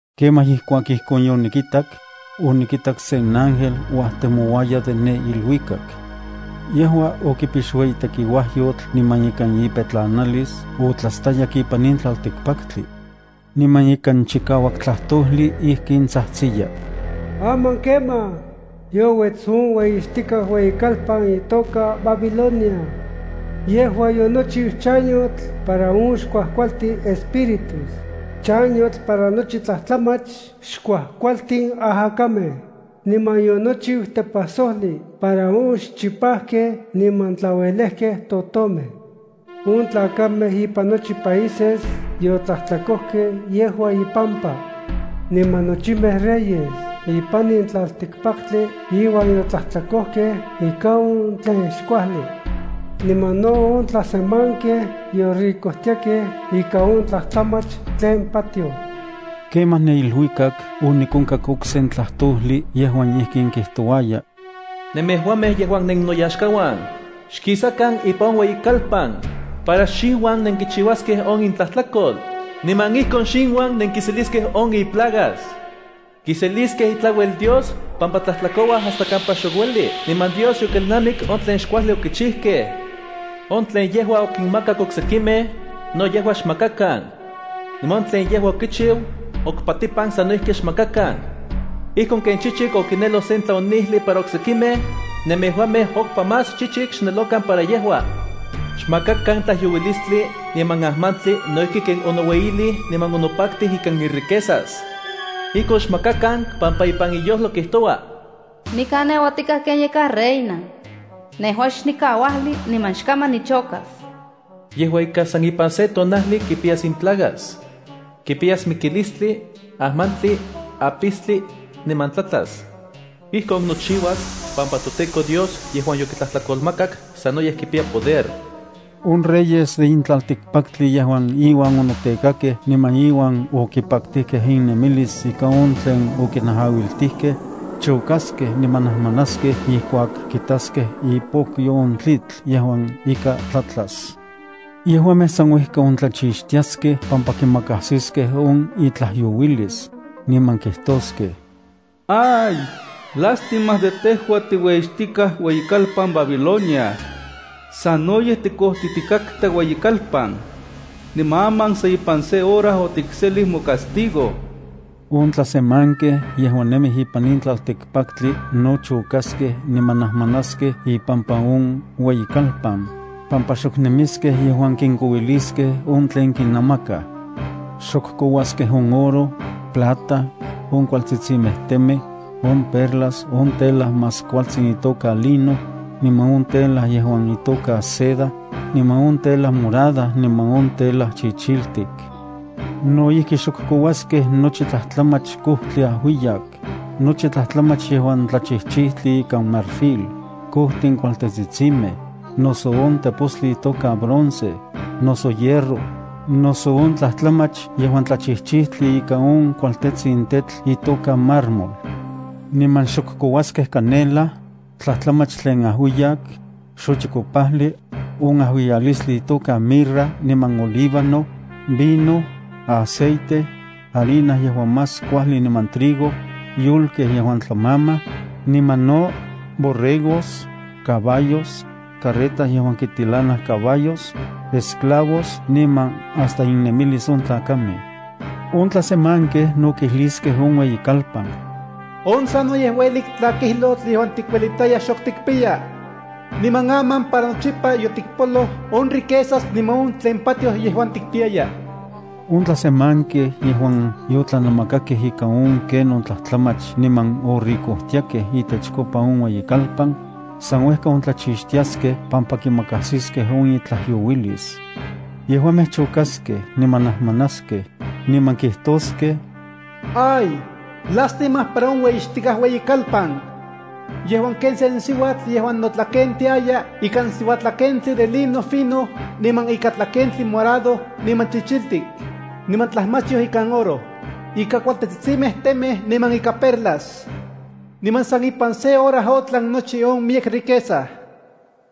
Kemaj ijkuak ijkon yonikitak, onikitak sen ángel uajtemouaya de ne iluikak. Yejua okipix ueyi tekiuajyotl niman ikan ipetlanalis otlastayak ipan in tlaltikpaktli. Niman ikan chikauak tlajtojli ijkin tsajtsiya: Aman kemaj, youets on ueyixtikaj ueyikalpan itoka Babilonia. Yejua yonochiu chanyotl para on xkuajkualtin espíritus, chanyotl para nochi tlajtlamach xkuajkualtin ajakamej, niman yonochiu tepajsojli para on xchipajkej niman tlauelejkej totomej. On tlakamej ipan nochi países yotlajtlakojkej yejua ipampa. Niman nochimej reyes ipan in tlaltikpaktli iuan yotlajtlakojkej ika on tlen xkuajli. Niman no on tlasemankej yoricojtiakej ika on tlajtlamach tlen patioj. Kemaj ne iluikak onikonkak okse tlajtojli yejuan ijkin kijtouaya: “Nemejuamej yejuan nennoyaxkauan, xkisakan ipan on ueyikalpan, para xinuan nenkichiuaskej on intlajtlakol, niman ijkon xinuan nenkiseliskej on iplagas. Kiseliskej itlauel Dios pampa tlajtlakouaj hasta kampa xok ueli, niman Dios yokelnamik on tlen xkuajli okichijkej. On tlen yejua okinmakak oksekimej, no yejua xmakakan. Niman on tlen yejua okichiu, okpatipan sano ijki xmakakan. Ijkon ken chichik okineloj sen tlaonijli para oksekimej, nemejuamej okpa más chichik xnelokan para yejua. Xmakakan tlajyouilistli niman ajmantli no ijki ken onoueyilij niman onopaktij ikan iriquezas. Ijkon xmakakan pampa ipan iyojlo kijtoua: ‘Nikan neuatikaj ken yakaj reina. Nejua xnikauajli, niman xkaman nichokas.’ Yejua ika, san ipan se tonajli kipiyas in plagas. Kipiyas mikilistli, ajmantli, apistli, niman tlatlas. Ijkon nochiuas pampa toTEKO Dios yejuan yokitlajtlakolmakak sanoyej kipiya poder.” On reyes de in tlaltikpaktli yejuan inuan onotekakej niman iuan okipaktijkej innemilis ika on tlen okinajauiltijkej, chokaskej, niman najmanaskej ijkuak kitaskej ipokyo on tlitl yejuan ika tlatlas. Yejuamej san uejka ontlachixtiaskej pampa kimakajsiskej on itlajyouilis, niman kijtoskej: ¡Ay, lástima de tejua tiueyixtikaj ueyikalpan Babilonia! ¡Sanoyej tikojtitikatka ueyikalpan! Niman aman san ipan se hora otikselij mocastigo. On tlasemankej yejuan nemij ipan in tlaltikpaktli no chokaskej niman najmanaskej ipampa on ueyikalpan, pampa xok nemiskej yejuan kinkouiliskej on tlen kinamakaj. Xok kouaskej on oro, plata, on kualtsitsimej temej, on perlas, on tela más kualtsin itoka lino, niman on tela yejuan itoka seda, niman on tela morada niman on tela chichiltik. No ijki xok kouaskej nochi tlajtlamach kojtli ajuiyak, nochi tlajtlamach yejuan tlachijchijtli ikan marfil, kojtin kualtetsitsimej, noso on tepostli itoka bronce, noso hierro, noso on tlajtlamach yejuan tlachijchijtli ika on kualtejtsin tetl itoka mármol. Niman xok kouaskej canela, tlajtlamach tlen ajuiyak, xochikopajli, on ajuiyalistin itoka mirra niman olíbano, vino, aceite, harina yejuan más kuajli niman trigo, yolkej yejuan tlamamaj, niman no, borregos, caballos, carretas yejuan kitilanaj caballos, esclavos niman hasta innemilis on tlakamej. On tlasemankej no kijliskej on ueyikalpan: ¡On sanoyej uelik tlakijlotl yejuan tikuelitaya, xok tikpiya! Niman aman para nochipa yotikpoloj on riquezas niman on tlen patioj yejuan tikpiyaya. On tlasemankej yejuan yotlanamakakej ika on ken on tlajtlamach niman oricojtiakej itechkopa on ueyikalpan, san uejka ontlachixtiaskej pampa kimakajsiskej on itlajyouilis. Yejuamej chokaskej niman najmanaskej, niman kijtoskej: ¡Ay, lástima para on ueyixtikaj ueyikalpan! Yejua ken sen siuatl yejuan notlakentiaya ikan siuatlakentli de lino fino, niman ikan tlakentli morado niman chichiltik, niman tlajmachyoj ikan oro, ikan kualtetsitsimej temej niman ikan perlas. ¡Niman san ipan se hora otlan nochi on miyek riqueza!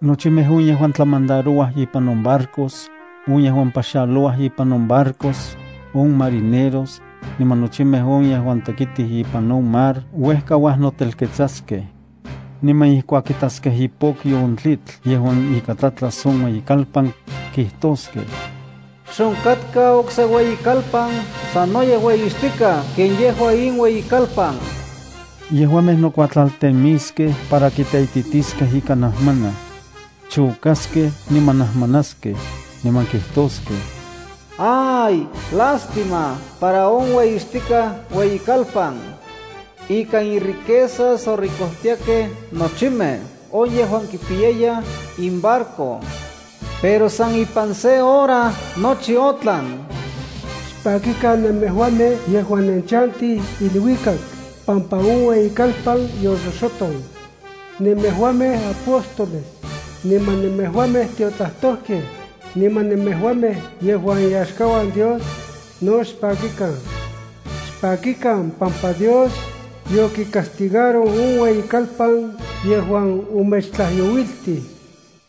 Nochimej on yejuan tlamandarouaj ipan on barcos, on yejuan paxalouaj ipan on barcos, on marineros, niman nochimej on yejuan tekitij ipan on mar uejka uajnotelketsaskej. Niman ijkuak kitaskej ipokyo on tlitl yejuan ika tlatlas on ueyikalpan, kijtoskej: “¡Xonkatka okse ueyikalpan sanoyej ueyixtikaj ken yejua in ueyikalpan!” Yejuamej nokuatlaltemiskej para kiteititiskej ika najmanaj. Chokaskej niman najmanaskej, niman kijtoskej: ¡Ay, lástima para on ueyixtikaj ueyikalpan! Ikan iriquezas orikojtiakej nochimej on yejuan kipiyayaj inbarco. ¡Pero san ipan sen hora nochi otlan! Xpakikan nemejuamej yejuan nenchantij iluikak pampa on ueyikalpan yoxoxoton. Nemejuamej apóstoles, niman nemejuamej tiotlajtojkej, niman nemejuamej yejuan iyaxkauan Dios, no xpakikan. Xpakikan pampa Dios yocastigaroj on ueyikalpan yejuan omechtlajyouiltij.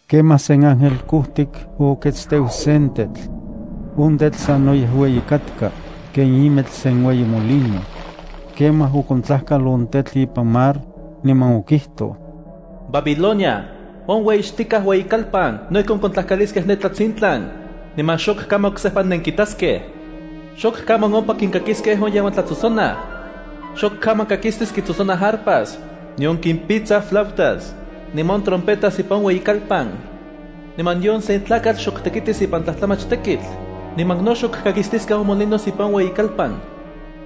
Kemaj sen ángel kojtik oketsteu sen tetl. On tetl sanoyej ueyi katka, ken imetl sen ueyi molino. Kemaj okontlajkal on tetl ipan mar, niman okijtoj: “Babilonia, on ueyixtikaj ueyikalpan no ijkon kontlajkaliskej ne tlatsintlan, niman xok kaman oksejpa nenkitaskej. Xok kaman ompa kinkakiskej on yejuan tlatsotsonaj. Xok kaman kakistis kitsotsonaj arpas, nion kimpitsaj flautas, niman on trompetas ipan on ueyikalpan. Niman nion se tlakatl xok tekitis ipan tlajtlamach tekitl, niman no xok kakistiskej on molinos ipan on ueyikalpan.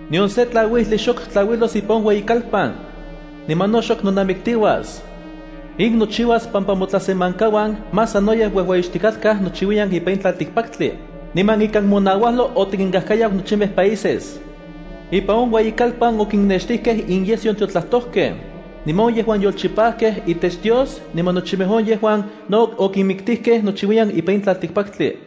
Nion se tlauijli xok tlauilos ipan on ueyikalpan. Niman no xok nonamiktiuas. In nochiuas pampa motlasemankauan más sanoyej uejueyixtikatkaj nochiuiyan ipan on tlaltikpaktli, niman ikan monauajlo otikinkajkayau nochimej países.” Ipan on ueyikalpan okinextijkej inyesyo on tiotlajtojkej, niman on yejuan yolchipajkej itech Dios niman nochimej on yejuan no okinmiktijkej nochiuiyan ipan in tlaltikpaktli.